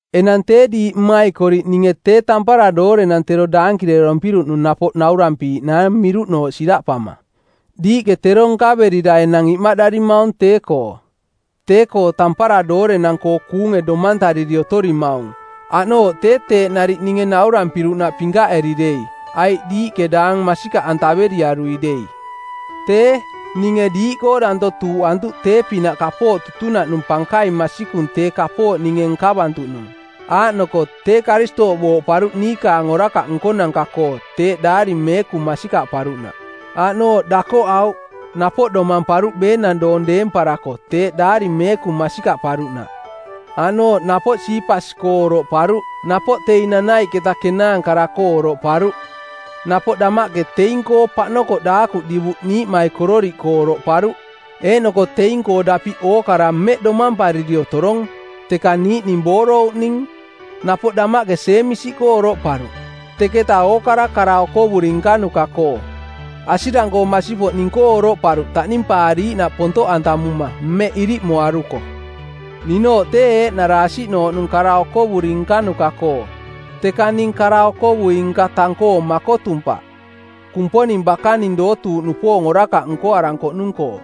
Enang tee diiꞌ mmaikoriꞌ ninge tee tampara doorenang tero daankirerompiruꞌnung napoꞌ noruꞌantarampiiꞌnaang miruꞌnooꞌ siraꞌpama. Diiꞌke tero nkaverira enang imaꞌdarimaung tee-koo. Tee-koo tampara doorenang-koo kuunge domantariri otorimaung, aꞌnooꞌ tee teeꞌ nariꞌ ninge naurampiruꞌnaꞌ pinkaꞌeri dei aiꞌ diiꞌke daang masikaꞌantaveriarui dei. Tee, ninge diiꞌkoo danto tuuꞌantuꞌ tee-pinaꞌ kapooꞌ tutunaꞌnung pankaing masikung tee kapooꞌ ninge nkavantuꞌnung. Aaꞌnoko tee Karistooꞌ booꞌparuꞌ niikaang orakaꞌ nkonanka-koo teeꞌ Daari Meekung masikaꞌparuꞌnaꞌ. Aaꞌnooꞌ dakoꞌauꞌ, napoꞌ domamparuꞌ beenang doong deemparako teeꞌ Daari Meekung masikaꞌparuꞌnaꞌ. Aaꞌnooꞌ napoꞌ Siipas-koo oroꞌparuꞌ, napoꞌ teing nanaiꞌketa kenaankara-koo oroꞌparuꞌ. Napoꞌ damaꞌke teing-koo paꞌnokoꞌ daakuꞌ divuꞌ niiꞌmaikororiꞌkoo oroꞌparuꞌ, Eeꞌnoko teing-koo dapiꞌ ookara mmeꞌ domampariri otorong, teka niiꞌning boorouꞌning. Napoꞌ damaꞌke Jeemisi-koo oroꞌparuꞌ, teketa ookara kara okovuri nkanuka-koo. Asirang-koo masipoꞌ ning-koo oroꞌparuꞌ taꞌnimpaariiꞌnaꞌ pontoꞌantamuma mmeꞌ iriꞌmoaruko. Ninooꞌ tee eeꞌnara asiꞌnooꞌnung kara okovuri nkanuka-koo, teka ning kara-okovui-nka tang-koo makotumpaꞌ, Kumponing bakaning dootuuꞌnupoong orakaꞌ nkoarankoꞌnung-koo.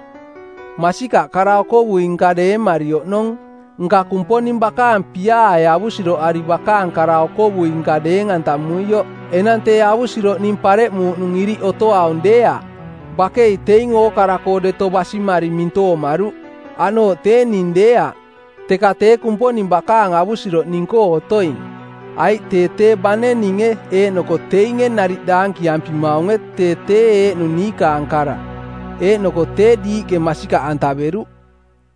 Masikaꞌ kara-okovui-nka deemari oꞌnong, nka Kumponing bakaang piaae avusiroꞌari bakaang kara-okovui-nka deeng-antamuioꞌ. Enang tee avusiroꞌ ning pareꞌmuuꞌnung iriꞌ otoaung deeaꞌ. Bakei teing ookara-koo deto basimari mintoomaruꞌ, aꞌnooꞌ tee ning deeaꞌ, teka tee Kumponing bakaang avusiroꞌ ning-koo otoing. Aiꞌ tee tee bane ninge eeꞌnoko teinge nariꞌ daankiampimaunge tee tee eeꞌnung niikaang kara, eeꞌnoko tee diiꞌke masikaꞌantaveruꞌ.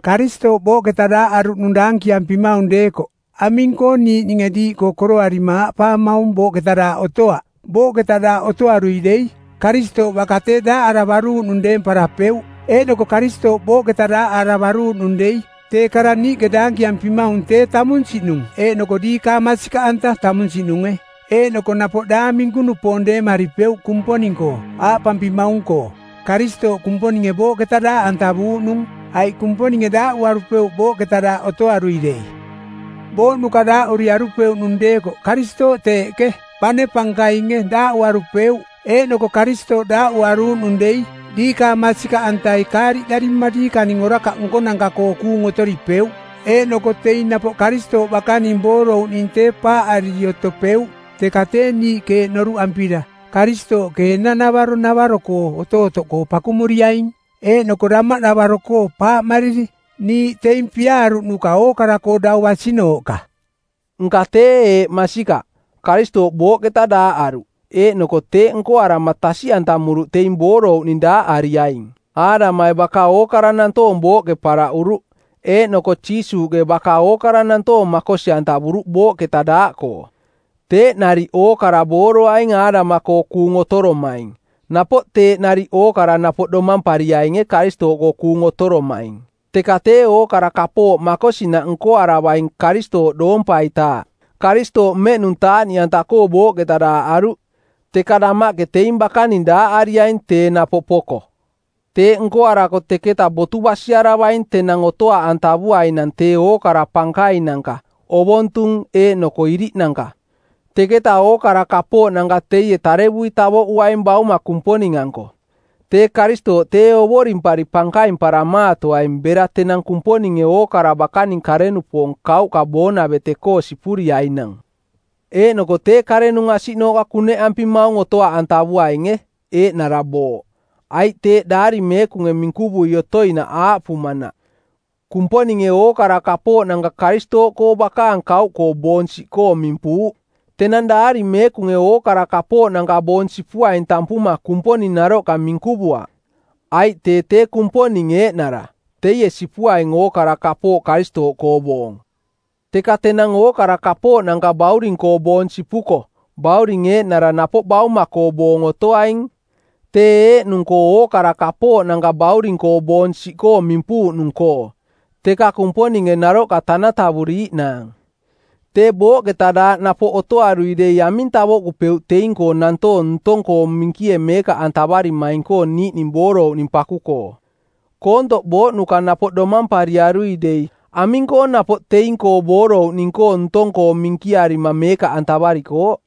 Karistooꞌ booꞌketa daaꞌaruꞌnung daankiampimaung deekoꞌ aming-koo niiꞌninge diiꞌkoo koroarima aaꞌpaamaung, “Booꞌketa daaꞌ otoaꞌ?” Booꞌketa daaꞌ otoarui dei, Karistooꞌ baka tee daaꞌaravaruuꞌnung deemparapeuꞌ. Eeꞌnoko Karistooꞌ booꞌketa daaꞌaravaruuꞌnung dei, tee kara niiꞌke daankiampimaung tee tamunsiꞌnung eeꞌnoko diikaang masikaꞌanta tamunsiꞌnunge, eeꞌnoko napoꞌ daang minku-nupoong deemaripeuꞌ Kumponing-koo, aaꞌpampimaung-koo, “Karistooꞌ Kumponinge booꞌketa daaꞌantavuuꞌnung,” aiꞌ Kumponinge daaꞌuarupeuꞌ booꞌketa daaꞌ otoarui dei. Booꞌnuka daaꞌuriarupeuꞌnung deekoꞌ Karistooꞌ teeꞌke, bane pankainge, daaꞌuarupeuꞌ. Eeꞌnoko Karistooꞌ daaꞌuaruuꞌnung dei diikaang masikaꞌantai kaariꞌdarima diikaning orakaꞌ nkonanka-koo kuung otoripeuꞌ. Eeꞌnoko teing napoꞌ Karistooꞌ bakaning boorouꞌning tee paaꞌariri otopeuꞌ. Teka tee niiꞌke eeꞌ noruꞌampira Karistooꞌke enang-navaro navaro-koo otootoꞌkoo pakumuriaing eeꞌnoko damaꞌnavaro-koo paaꞌmariri, niiꞌ teing piaaruꞌnuka ookara-koo dau basinooꞌka. Nka tee eeꞌ masikaꞌ: Karistooꞌ booꞌketa daaꞌaruꞌ, eeꞌnoko teeꞌ nkoarama tasiꞌantamuruꞌ teing boorouꞌning daaꞌariaing. Aadamai baka ookara nantoong booꞌke paraꞌuruꞌ, eeꞌnoko Jiisuuꞌke baka ookara nantoong makosi-antavuruꞌ booꞌketa daaꞌkoo. Teeꞌ nariꞌ ookara booroaing Aadama-koo kuung otoromaing, napoꞌ teeꞌ nariꞌ ookara napoꞌ domampariainge Karistooꞌkoo kuung otoromaing. Teka tee ookara kapooꞌ makosinaꞌ nkoaravaing Karistooꞌ doompaitaaꞌ. Karistooꞌ mmeꞌnung taaꞌniꞌanta-koo booꞌketa daaꞌaruꞌ, teka damaꞌke teing bakaning daaꞌariaing tee napoꞌ poko. Teeꞌ nkoarako teketa botu basiaravaing tenang otoaꞌantavuainang teing ookara pankainanka, ovontung eeꞌnoko iriꞌnanka, teketaꞌ ookara kapooꞌnanka teie tarevui tavoꞌuaing Bauma Kumponing-anko. Tee Karistooꞌ tee ovorimpari pankaimparamaatoaing bera tenang Kumponinge ookara bakaning kare-nupoong kauꞌka boonavete-koo sipuriainang. Eeꞌnoko tee karenung asiꞌnooꞌka kuneꞌampimaung otoaꞌantavuainge, eeꞌnara booꞌ. Aiꞌ teeꞌ Daari Meekunge minkuvui otoinaꞌ aaꞌpuuꞌnaꞌ, “Kumponinge ookara kapooꞌnanka Karistooꞌkoo bakaang kauꞌkoo boong siꞌkoo mimpuuꞌ.” Tenang Daari Meekunge ookara kapooꞌnanka boong sipuaing tampuma Kumponing naroꞌka minkuvuaꞌ, aiꞌ tee tee Kumponing eeꞌnara teie sipuaing ookara kapooꞌ Karistooꞌkoo boong. Teka tenang ookara kapooꞌnanka Bauring-koo boong sipuko Bauring eeꞌnara napoꞌ Bauma-koo boong otoaing tee eeꞌnung-koo ookara kapooꞌnanka Bauring-koo boong siꞌkoo mimpuuꞌnung-koo, teka Kumponinge naroꞌka tanatavuriiꞌnaang. Tee booꞌketa daaꞌ napoꞌ otoarui dei aming tavoꞌkupeuꞌ teing-koo nantoong ntong-koo minkie meekaꞌantavarimaing-koo niiꞌning boorouꞌning paku-koo? Koontoꞌ booꞌnuka napoꞌ domampariarui dei, aming-koo napoꞌ teing-koo boorouꞌning-koo ntong-koo minkirarima meekaꞌantararikooꞌ?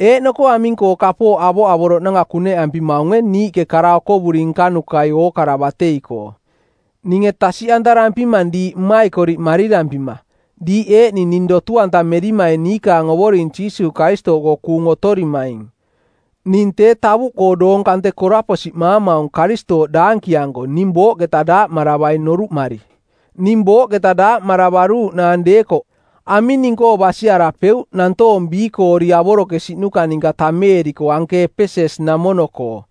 Eeꞌnoko aming-koo kapooꞌ avoꞌavoroꞌnanka kuneꞌampimaunge niiꞌke kara okovuri nkanukai ookara batei-koo? Ninge tasiꞌantarampimang diiꞌ mmaikoriꞌ marirampima, diiꞌ eeꞌning ning dotu-antameri niikaang Ovoring Jiisuuꞌ Karistooꞌkoo kuung otorimaing: Ning tee tavuꞌkoo doong kante koraposiꞌmaamaung Karistooꞌ daankianko ning booꞌketa daaꞌmaravaing noruꞌmari. Ning booꞌketa daaꞌmaravaruuꞌnaang deekoꞌ, aming ning-koo basiarapeuꞌ nantoong biikoori avorokesiꞌnuka ninka tameeriko anke Epeses-namono-koo?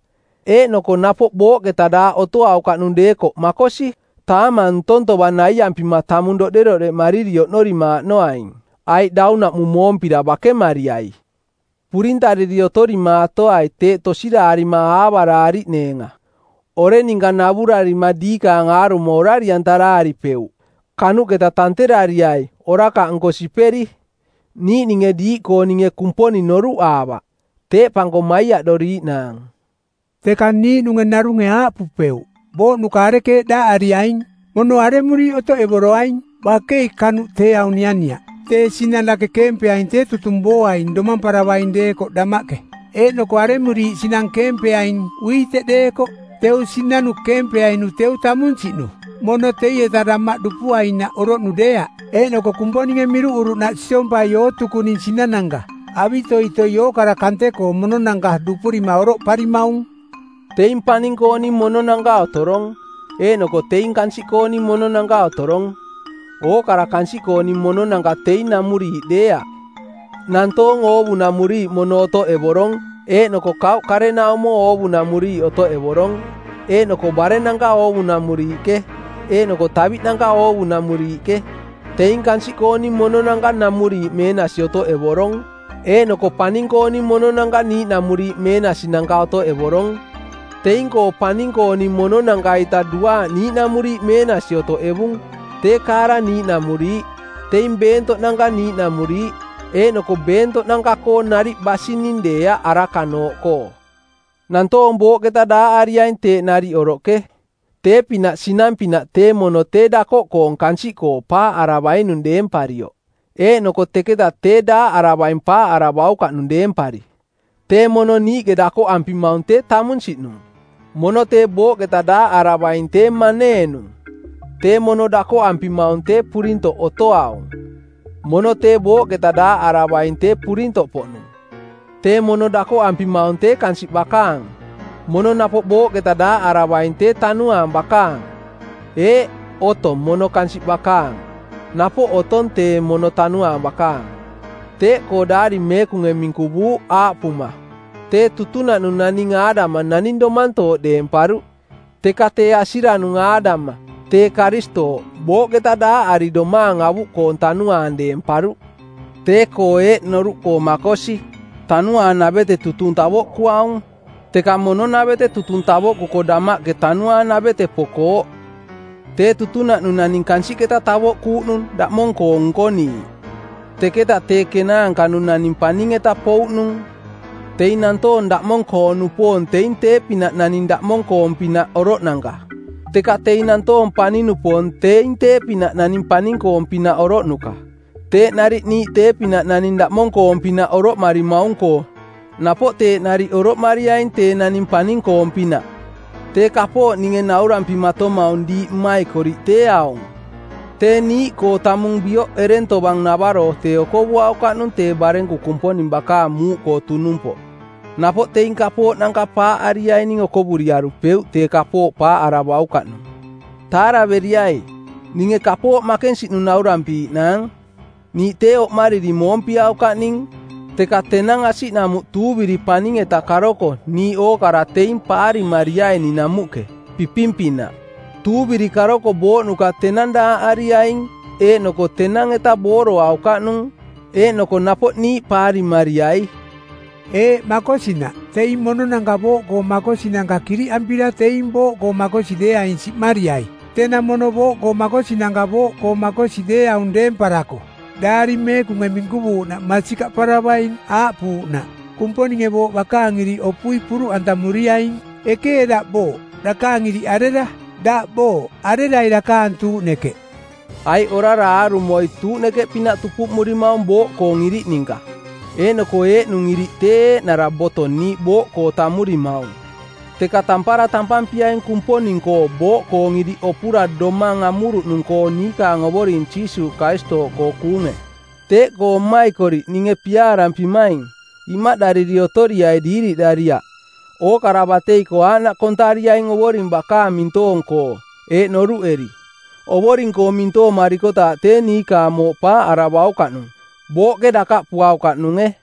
Eeꞌnoko napoꞌ booꞌketa daaꞌ otoaukaꞌnung deekoꞌ, makosi, “taamang ntong tovang naiampima tamung doꞌderoꞌdeꞌmariri oꞌnorimaaꞌnoaing, aiꞌ daunaꞌmung moompira bakemariai.” Purintariri otorimaatoai teeꞌ tosiraarima aavaraariꞌneenga. “Oreng ninka navurarima diikaang aarumo orari-antaraaripeuꞌ.” Kanuꞌketa tanterariai orakaꞌnko siperi. Niiꞌninge diiꞌkooninge Kumponing noruꞌaavaꞌ. Teeꞌpanko maiaꞌdoriiꞌnaang. Teka niiꞌnung narunge aaꞌpupeuꞌ, “Booꞌnuka arekeeꞌ daaꞌariaing? Mono aremuriiꞌ otoꞌevoroaing?” Bakei kanuꞌ tee aung nianiaꞌ. Tee sinang dake keempeaing tee tutung booaing domamparavaing deekoꞌ damaꞌke. Eeꞌnoko aremuriiꞌ sinang keempeaing, uiteꞌ deekoꞌ, teu sinanu keempeainu teu tamunsiꞌnu, mono teieta damaꞌ dupuainaꞌ oroꞌnu deeaꞌ. Eeꞌnoko Kumponinge miruꞌuruꞌnaꞌ siompai ootukuning sinananka avitoitoi ookara kante-koo mononanka dupurima oroꞌparimaung. Teing paning-kooning mononanka otorong, eeꞌnoko teing kansiꞌkooning mononanka otorong. Ookara kansiꞌkoong mononanka teing namuriiꞌ deeaꞌ. Nantoong oovunamuriiꞌ mono otoꞌevorong, eeꞌnoko kauꞌ karenaumo oovunamuriiꞌ otoꞌevorong, eeꞌnoko barennanka oovunamuriiꞌke, eeꞌnoko taviꞌnanka oovunamuriiꞌke. Teing kansiꞌkooning mononanka namuriiꞌ meenasi otoꞌevorong, eeꞌnoko paning-kooning mononanka niiꞌnamuriiꞌ meenasinanka otoꞌevorong. Teing-koo paning-kooning mononanka-ita duaaꞌ niiꞌnamuriiꞌ meenasi otoꞌevung, tee kaara niiꞌnamuriiꞌ, teing beentoꞌnanka niiꞌnamuriiꞌ. Eeꞌnoko beentoꞌnanka-koo nariꞌ basining deeaꞌ arakanooꞌkoo. Nantoong booꞌketa daaꞌariaing teeꞌ nariꞌ oroꞌke, tee-pinaꞌ sinang-pinaꞌ tee mono tee dakoꞌkoong kansiꞌkoo paaꞌaravainung deemparioꞌ, eeꞌnoko teketa tee daaꞌaravaing paaꞌaravaukaꞌnung deempari. Tee mono niiꞌke dakoꞌampimaung tee tamunsiꞌnung. Mono tee booꞌketa daaꞌaravaing tee maneenung. Tee mono dakoꞌampimaung tee purintoꞌ otoaung. Mono tee booꞌketa daaꞌaravaing tee purintoꞌpoꞌnung. Tee mono dakoꞌampimaung tee kansiꞌ bakaang. Mono napoꞌ booꞌketa daaꞌaravaing tee tanuaang bakaang. Eeꞌ, otong mono kansiꞌ bakaang. Napoꞌ otong tee mono tanuaang bakaang. Teeꞌkoo Daari Meekunge minkuvuuꞌ, aaꞌpuma, “Tee tutunaꞌnung naning Aadama naning domantooꞌ deemparuꞌ.” Teka tee asiranung Aadama (tee Karistooꞌ) booꞌketa daaꞌari domaang avuꞌkoong tanuaang deemparuꞌ. Tee-koo eeꞌ noruꞌkoo makosi: Tanuaanavete tutung tavoꞌkuaung, teka mono-navete tutung tavoꞌkuko damaꞌke tanuaanavete pokooꞌ. Tee tutunaꞌnung naning kansiꞌketa tavoꞌkuuꞌnung daꞌmong-koong nkoniiꞌ. Teka tee kenaanka-nung naning paning-eta pouꞌnung. Teing nantoong daꞌmong-koo-nupoong teing tee-pinaꞌ naning daꞌmong-koong-pinaꞌ oroꞌnanka. Teka teing nantoong paning-nupoong teing tee-pinaꞌ naning paning-koong-pinaꞌ oroꞌnuka. Teeꞌ nariꞌ niiꞌ tee-pinaꞌ naning daꞌmong-koong-pinaꞌ oroꞌmarimaung-koo napoꞌ teeꞌ nariꞌ oroꞌmariaing tee naning paning-koong-pinaꞌ. Tee kapooꞌ ninge naurampimatomaung diiꞌ mmaikoriꞌ tee aung: Tee niiꞌkoo tamung bioꞌ ereng tovang navaro tee okovuaukaꞌnung tee barenku Kumponing bakaang muuꞌkoo tunumpoꞌ. Napoꞌ teing kapooꞌnanka paaꞌariaining okovuriarupeuꞌ tee kapooꞌ paaꞌaravaukaꞌ nung. Taaraveriai, ninge kapooꞌ makensiꞌnung naurampiiꞌnaang: Niiꞌ tee oꞌmariri moompiaukaꞌning, teka tenang asiꞌnamuꞌ tuuviri paning-eta karoko niiꞌ ookara teing paarimariaining namuꞌke, piping-pinaꞌ. Tuuviri karoko booꞌnuka tenang daaꞌariaing eeꞌnoko tenang-eta booroaukaꞌnung, eeꞌnoko napoꞌ niiꞌ paarimariai. Eeꞌ makosinaꞌ: Teing mononanka booꞌkoo makosinanka kiriꞌampira teing booꞌkoo makosi deeaing siꞌmariai. Tenang mono booꞌkoo makosinanka booꞌkoo makosi deeaung deemparako Daari Meekunge minkuvuuꞌnaꞌ masikaꞌparavaing aaꞌpuuꞌnaꞌ, “‘Kumponinge booꞌ bakaang iriꞌ opui puruꞌantamuriaing.” “Ekee daꞌ booꞌ, dakaang iriꞌ arera? Daꞌ booꞌ, arerai dakaang tuuꞌnekeꞌ?” Aiꞌ orara aarumoi tuuꞌnekeꞌpinaꞌ tupuꞌmurimaung booꞌkoong iriꞌ ninka, eeꞌnoko eeꞌnung iriꞌ tee eeꞌnara boto niiꞌ booꞌkoo tammurimaung. Teka tampara tampampiaing Kumponing-koo booꞌkoong iriꞌ opura domang amuruꞌnung-koo niikaang Ovoring Jiisuuꞌ Karistooꞌkoo kuunge. Teeꞌkoo mmaikoriꞌ ninge piaavarampimaing, imaꞌdariri otoriai diiriꞌdariaꞌ. Ookara batei-koo aaꞌnaꞌ kontariaing Ovoring bakaang mintoong-koo eeꞌ noruꞌeri: Ovoring-koo mintoomarikotaaꞌ tee niikaang mooꞌ paaꞌaravaukaꞌnung; booꞌke dakaꞌpuaukaꞌnunge.